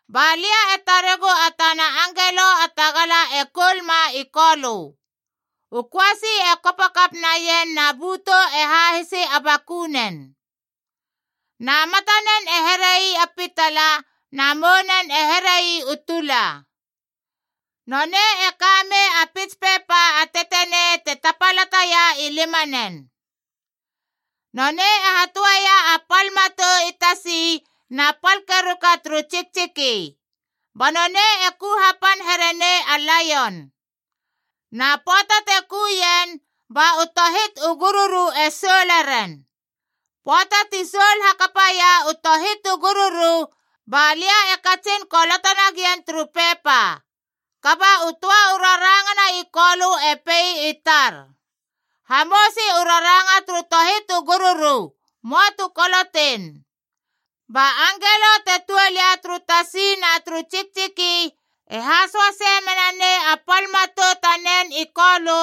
Ba lia e taregu a tana angelo a tagala e koulma i Kolö. U köasi e kopo kap naien na bötou e hahisi a bakunen. Na matanen e here ii a pitala, na mounen e here ii u tula. Nonei e ka mei a pits pepa a tetenei te tapalataia i limanen. Nonei e hatöeia a pal matou i tasi na pal keruka turu tsiktsiki. Ba nonei e ku hapan herenei a laion. Na pöata te ku ien, ba u tohit u gururu e soule ren. Pöata ti soul hakapa ia u tohit u gururu, ba lia e katsin koloto nagien turu pepa. Kaba u töa u rarangana i Kolö e pei i tar, “Hamousi u raranga turu tohit u gururu, möa tu koloteien.” Ba angelo te tuol ia turu tasi na turu tsiktsiki e hasoasei menanei a pal matou tanen i Kolö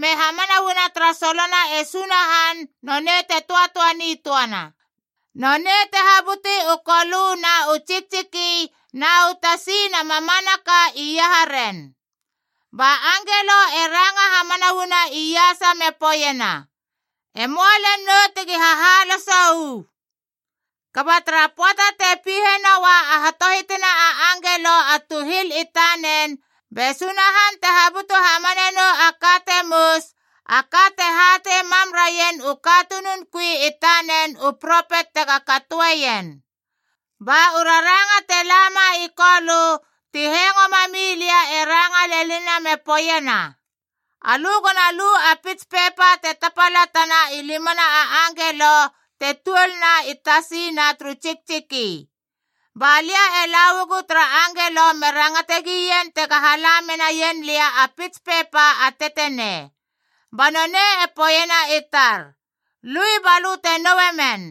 me hamana uana tara solona e Sunahan nonei te töatöa nitöana, nonei te habuti u kolö na u tsiktsiki na u tasi na mamanaka iaharen. Ba angelo e ranga hamana uana iasa me poeiena, “E möa lel nou tegi hahaloso uu! Kaba tara pöata te pihe noa a hatohitina a angelo a tuhil i tanen, be Sunahan te habutu hamane nou a ka te mous, a ka te hatei mam raien u katunun kui i tanen u propet tega katoeien.” Ba u raranga te lama i Kolö ti hengo mami lia e ranga lenina me poeiena, “Alö gona lu a pits pepa te tapalatana i limana a angelo te tuolna i tasi na turu tsiktsiki.” Ba lia e la uagu tara angelo me rangate gien tega hala menaien lia a pits pepa a tetenei. Ba nonei e poeiena i tar, “Lui, balö te noue men.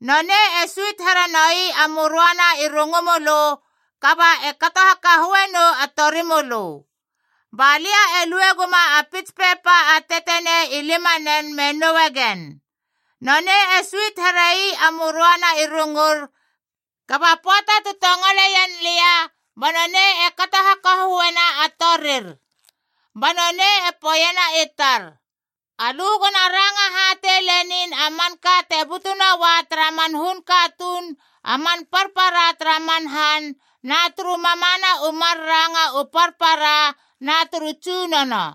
Nonei e suit here noi a möröana i rungu mölö, kaba e kato hakahöe nou a torimölö.” Ba lia e lue guma a pits pepa a tetenei i limanen me noue gen. Nonei e suit here ii a möröana i rungur, kaba pöata tu tongoleien lia ba nonei e kato hakahöena a torir. Ba nonei e poeiena i tar, “Alö gona ranga hatei lenin a manka te butu noua tara man hun katuun a man parpara tara man han, na turu mamana u mar ranga u parpara na turu tsunono.”